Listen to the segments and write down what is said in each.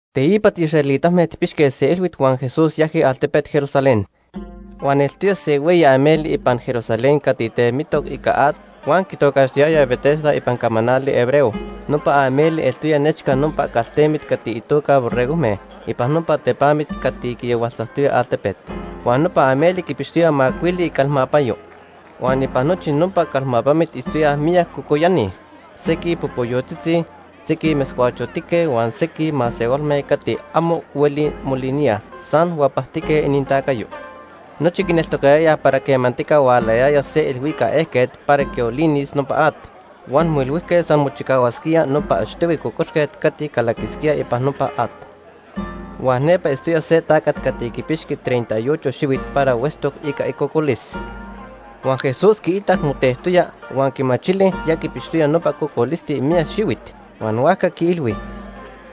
Teipa tiisraelitame tijpixque se ilhuit huan Jesús yajqui altepet Jerusalén. Huan eltoya se hueyi ameli ipan Jerusalén cati temitoc ica at huan quitocaxtiyayaj Betesda ipan camanali hebreo. Nopa ameli eltoya nechca nopa caltemit cati itoca “Borregojme” ipan nopa tepamit cati quiyahualtzactoya altepet. Huan nopa ameli quipixtoya macuili icalmapanyo. Huan ipan nochi nopa calmapamit itztoyaj miyac cocoyani; sequij popoyotzitzi, sequij metzcuachotique huan sequij masehualme cati amo huelij moliníaj, san huapactique inintacayo. Nochi quineltocayayaj para quemantica hualayaya se ilhuicac ejquet para quiolinis nopa at, huan moilhuijque san mochicahuasquía nopa achtohui cocoxquet cati calaquisquía ipan nopa at. Huan nepa itztoya se tacat cati quipixqui treinta y ocho xihuit para huetztoc ica icocolis. Huan Jesús quiitac motectoya, huan quimachili ya quipixtoya nopa cocolisti miyac xihuit, huan huajca quiilhui: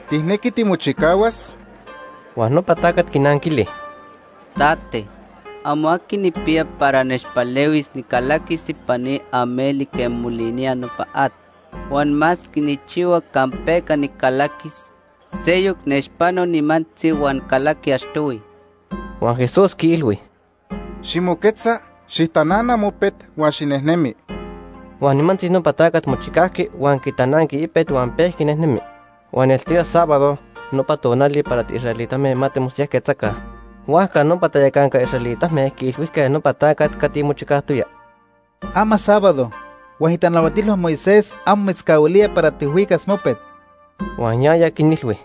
―¿Tijnequi timochicahuas? Huan nopa tacat quinanquili: ―Tate, amo aqui nijpiya para nechpalehuis nicalaquis ipan ni ameli quema molinía nopa at. Huan masque nijchihua campeca nicalaquis, seyoc nechpano nimantzi huan calaqui achtohui. Huan Jesús quiilhui: ―Ximoquetza, xijtanana mopet huan xinejnemi. Huan nimantzi nopa tacat mochicajqui, huan quitananqui ipet huan pejqui nejnemi. Huan eltoya sábado, nopa tonali para tiisraelitame ma timosiyajquetzaca. Huajca nopa tayacanca israelitame quiilhuijque nopa tacat cati mochicajtoya: ―Ama sábado huan itanahuatilhua Moisés amo mitzcahuilía para tijhuicas mopet. Huan yaya quinilhui: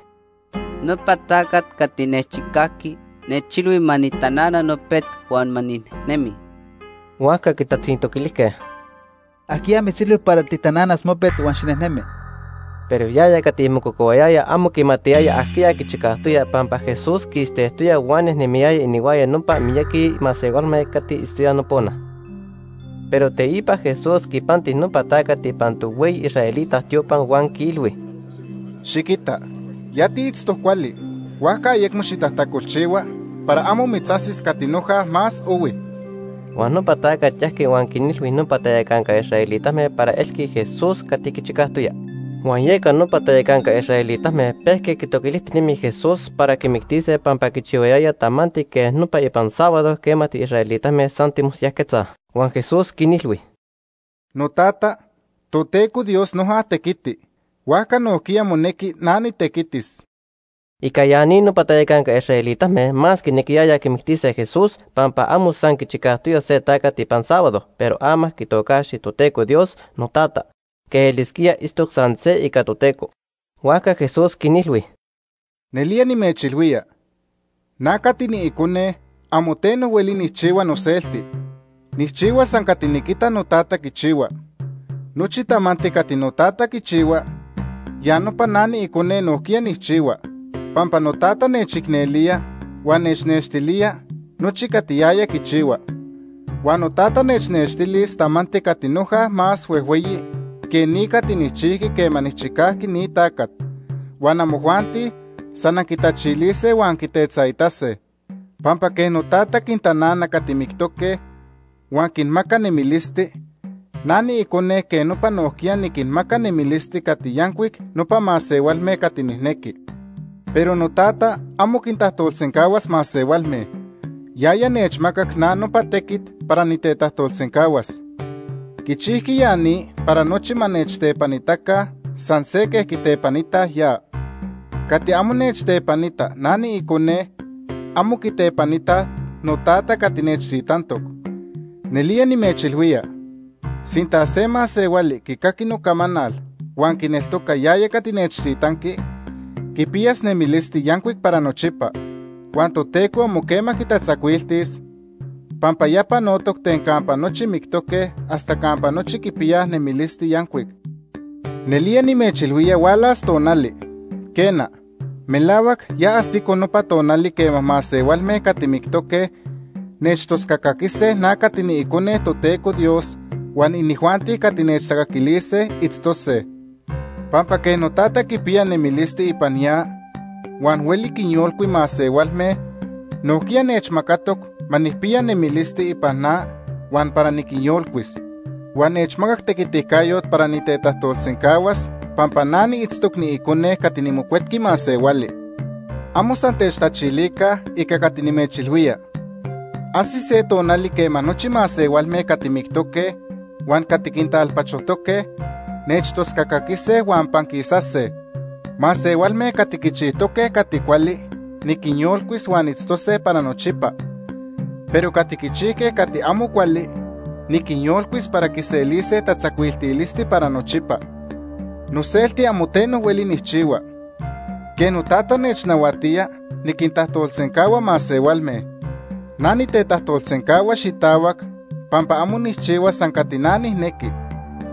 ―Nopa tacat cati nechchicajqui, nechilhui ma nijtanana nopet huan ma ninejnemi. Huajca quitatzintoquilijque: ―¿Ajquiya mitzilhui para tijtananas mopet huan xinejnemi? Pero yaya cati mococohuayaya amo quimatiyaya ajquiya quichicajtoya pampa Jesús quistejtoya huan nejnemiyaya inihuaya nopa miyaqui masehualme cati itztoyaj nopona. Pero teipa Jesús quipanti nopa tacat ipan tohueyi israelita tiopa huan quiilhui: ―Xiquita, ya tiitztoc cuali, huajca ayecmo xitajtacolchihua para amo mitzajsis cati noja más ohui. Huan nopa tacat yajqui huan quinilhui nopa tayacanca israelitame para elqui Jesús cati quichicajtoya. Huan yeca nopa tayacanca israelitame pejque quitoquilijtinemij Jesús para quimictise pampa quichihuayaya tamanti quej nopa ipan sábado quema tiisraelitame san timosiyajquetzaj. Huan Jesús quinilhui: ―NoTata, Toteco Dios noja tequiti, huajca nojquiya monequi na nitequitis. Ica ya ni nopa tayacanca israelitame más quinequiyayaj quimictise Jesús, pampa amo san quichicajtoya se tacat ipan sábado pero ama quitocaxti Toteco Dios: “NoTata”, quej elisquía itztoc san se ica Toteco. Huajca Jesús quinilhui: “Nelía nimechilhuía, na cati niIcone amo teno hueli nijchihua noselti. Nijchihua san cati niquita noTata quichihua. Nochi tamanti cati noTata quichihua, ya nopa na niIcone nojquiya nijchihua, pampa noTata nechicnelía huan nechnextilía nochi cati yaya quichihua. Huan noTata nechnextilis tamanti cati noja más huejhueyi que ni cati nijchijqui quema nijchicajqui ni tacat, huan amojuanti san anquitachilise huan anquitetzaitase. Pampa quej noTata quintanana cati mictoque huan quinmaca nemilisti, na niIcone quej nopa nojquiya niquinmaca nemilisti cati yancuic nopa masehualme cati nijnequi. Pero noTata amo quintajtolsencahuas masehualme. Yaya nechmacac na nopa tequit para nitetajtolsencahuas. Quichijqui ya ni para nochi ma nechtepanitaca san se quej quitepanitaj ya. Cati amo nechtepanitaj na niIcone, amo quitepanitaj noTata cati nechtitantoc. “Nelía nimechilhuía, sinta se masehuali quicaqui nocamanal huan quineltoca yaya cati nechtitanqui, quipiyas nemilisti yancuic para nochipa. Huan Toteco amo quema quitatzacuiltis pampa ya panotoc ten campa nochi mictoque hasta campa nochi quipiyaj nemilisti yancuic. Nelía nimechilhuía hualas tonali, quena, melahuac ya ajsico nopa tonali quema masehualme cati mictoque nechtoscacaquise na cati niIcone Toteco Dios, huan inijuanti cati nechtacaquilise, itztose. Pampa quej noTata quipiya nemilisti ipan ya huan hueli quinyolcui masehualme, nojquiya nechmacatoc ma nijpiya nemilisti ipan na huan para niquinyolcuis. Huan nechmacac tequiticayot para nitetajtolsencahuas pampa na niitztoc niIcone cati niMocuetqui Masehuali. Amo san techtachilica ica cati nimechilhuía. Ajsis se tonali quema nochi masehualme cati mictoque huan cati quintalpachojtoque, nechtoscaquise huan panquisase. Masehualme cati quichijtoque cati cuali niquinyolcuis huan itztose para nochipa, pero cati quichijque cati amo cuali niquinyolcuis para quiselise tatzacuiltilisti para nochipa. “Noselti amo teno hueli nijchihua. Quej noTata nechnahuatía, niquintajtolsencahua masehualme. Na nitetajtolsencahua xitahuac pampa amo nijchihua san cati na nijnequi,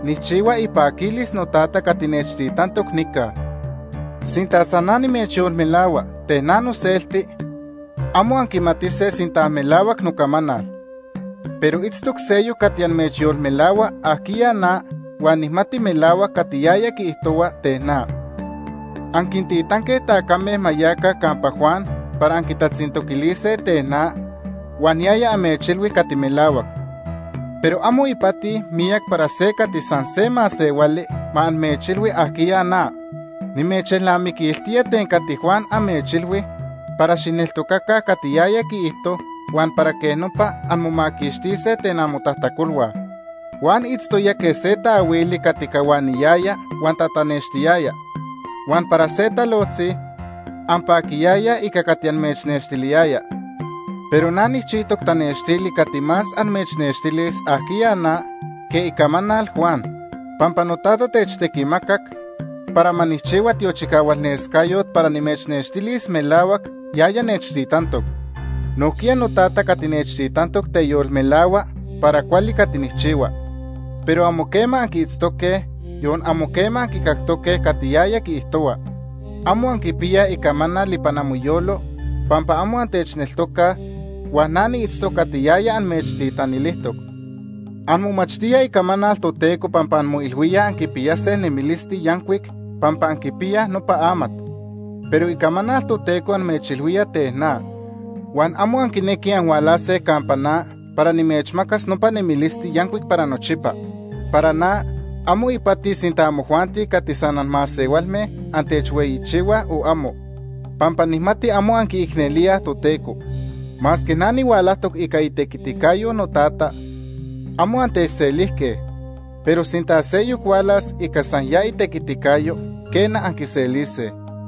nijchihua ipaquilis noTata cati nechtitantoc nica. Sinta san na nimechyolmelahua ten na noselti, amo anquimatise sinta melahuac nocamanal. Pero itztoc seyoc cati amechyolmelahua ajquiya na huan nijmati melahuac cati yaya quiijtohua ten na. Anquintitanque tacame ma yaca campa Juan para anquitatzintoquilise ten na, huan yaya amechilhui cati melahuac. Pero amo ipati miyac para se cati san se masehuali ma amechilhui ajquiya na. Nimechelnamiquiltía ten cati Juan amechilhui para xijneltocaca cati yaya quiijto huan para quej nopa anmomaquixtise ten amotajtacolhua. Juan itztoya quej se taahuili cati cahuaniyaya huan tatanextiyaya, huan para se talojtzi anpaquiyayaj ica cati amechnextiliyaya. Pero na nijchijtoc tanextili cati más amechnextilis ajquiya na que icamanal Juan, pampa noTata nechtequimacac para ma nijchihua tiochicahualnescayot para nimechnextilis melahuac yaya nechtitantoc. Nojquiya noTata cati nechtitantoc teyolmelahua para cuali cati nijchihua. Pero amo quema anquiitztoque, yon amo quema anquicactoque cati yaya quiijtohua. Amo anquipiyaj icamanal ipan amoyolo pampa amo antechneltocaj, huan na niitztoc cati yaya amechtitanilijtoc. Anmomachtíaj Icamanal Toteco pampa anmoilhuíaj anquipiyase nemilisti yancuic pampa anquipiyaj nopa amat. Pero Icamanal Toteco amechilhuía ten na, huan amo anquinequij anhualase antechneltocase para nimechmacas nopa nemilisti yancuic para nochipa. “Para na, amo ipati sinta amojuanti cati san anmasehualme antechhueyichihuaj o amo, pampa nijmati amo anquiicnelíaj Toteco. Masque na nihualajtoc ica itequiticayo noTata, amo antechselijque. Pero sinta seyoc hualas ica san ya itequiticayo, quena, anquiselise.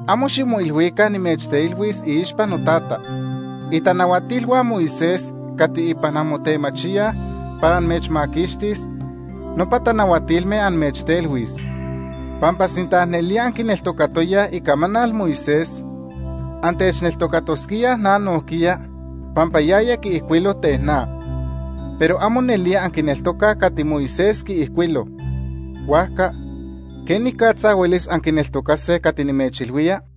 Amo ximoilhuica nimechtelhuis iixpa noTata. Itanahuatilhua Moisés cati ipan anmotemachíaj para amechmaquixtis, nopa tanahuatilme amechtelhuis. Pampa sinta nelía anquineltocatoyaj icamanal Moisés, antechneltocatosquíaj na nojquiya pampa yaya quiijcuilo ten na. Pero amo nelía anquineltocaj cati Moisés quiijcuilo; huajca ¿quenicatza huelis anquineltocase cati nimechilhuía?”